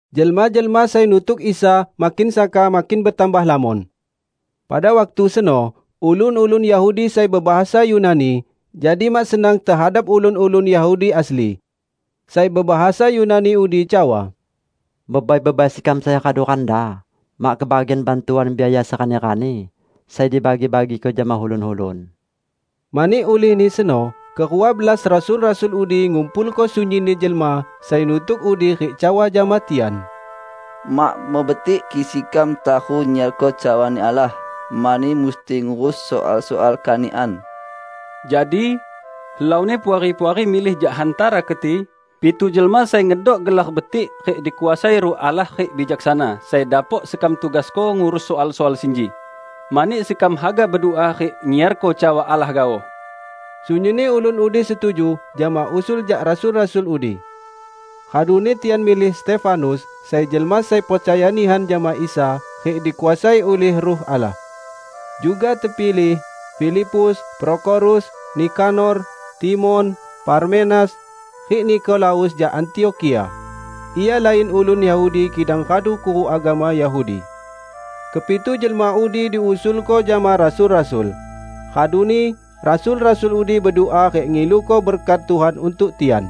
Jelma-jelma sai nutuk Isa makin saka makin betambah lamon. Pada waktu seno ulun-ulun Yahudi sai bebahasa Yunani, jadi mak senang tehadap ulun-ulun Yahudi asli. Sai bebahasa Yunani udi cawa, "Bebai-bebai sekam sai radu randa mak kebagian bantuan biaya serani-rani sai dibagi-bagiko jama ulun-ulun." Mani ulihni seno, kerua belas rasul-rasul udi ngumpulko sunyinni jelma sai nutuk udi rik cawa jama tian, "Mak mebetik kik sekam taru nyiarko cawani Allah, mani musti ngurus soal-soal kanikan. Jadi, helauni Puari-puari milih jak hantara keti pitu jelma sai ngedok gelar betik rik dikuasai Ruh Allah rik bijaksana, sai dapok sekam tugasko ngurus soal-soal sinji; mani sekam haga bedua rik nyiarko cawa Allah gaoh." Sunyinni ulun udi setuju jama usul jak rasul-rasul udi. Raduni tian milih Stefanus, sai jelma sai percaya nihan jama Isa rik dikuasai ulih Ruh Allah. Juga tepilih: Filipus, Prokhorus, Nikanor, Timon, Parmenas, rik Nikolaus jak Antiokhia; ia lain ulun Yahudi kidang radu kuruk agama Yahudi. Kepitu jelma udi diusulko jama rasul-rasul, raduni rasul-rasul udi bedua rik ngiluko berkat Tuhan untuk tian.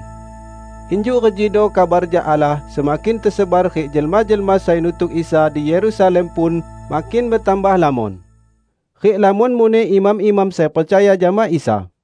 Injuk rejido kabar jak Allah semakin tesebar rik jelma-jelma sai nutuk Isa di Yerusalem pun makin betambah lamon. Rik lamon muneh imam-imam sai percaya jama Isa.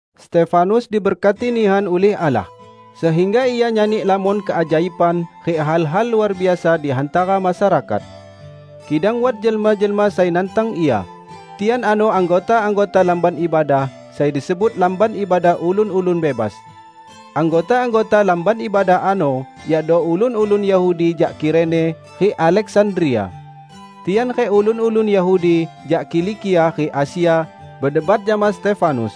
Stefanus diberkati nihan ulih Allah, sehingga ia nyani lamon keajaiban rik hal-hal luar biasa di hantara masyarakat. Kidang wat jelma-jelma sai nantang ia; tian ano anggota-anggota lamban ibadah sai disebut Lamban Ibadah Ulun-ulun Bebas. Anggota-anggota lamban ibadah ano yakdo ulun-ulun Yahudi jak Kirene rik Aleksandria. Tian rik ulun-ulun Yahudi jak Kilikia rik Asia bedebat jama Stefanus.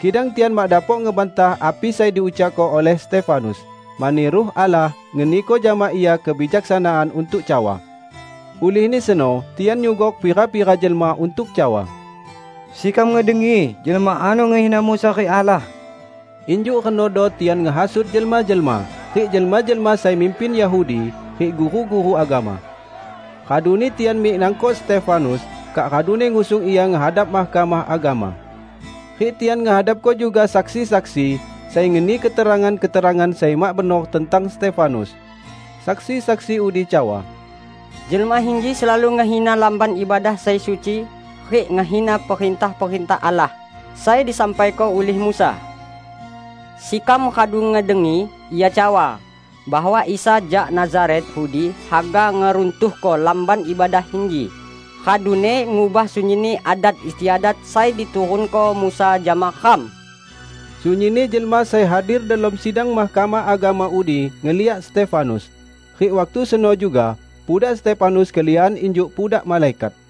Kidang tian mak dapok ngebantah api sai diucakko ulih Stefanus, mani Ruh Allah ngeniko jama ia kebijaksanaan untuk cawa. Ulihni seno tian nyugok pira-pira jelma untuk cawa, "Sekam ngedengi jelma ano ngehina Musa rik Allah!" Injuk renodo tian ngehasut jelma-jelma, rik jelma-jelma sai mimpin Yahudi, rik guru-guru agama. Raduni tian mik nangkok Stefanus, kak raduni ngusung ia ngehadap Mahkamah Agama. Rik tian ngehadapko juga saksi-saksi sai ngeni keterangan-keterangan sai mak benor tentang Stefanus. Saksi-saksi udi cawa, "Jelma inji selalu ngehina Lamban Ibadah sai suci rik ngehina perintah-perintah Allah sai disampaiko ulih Musa. Sekam radu ngedengi ia cawa, bahwa Isa jak Nazaret udi haga ngeruntuhko Lamban Ibadah inji, raduni ngubah sunyinni adat istiadat sai diturunko Musa jama ram!" Sunyinni jelma sai hadir delom sidang Mahkamah Agama udi ngeliak Stefanus. Rik waktu seno juga pudak Stefanus keliakan injuk pudak malaikat.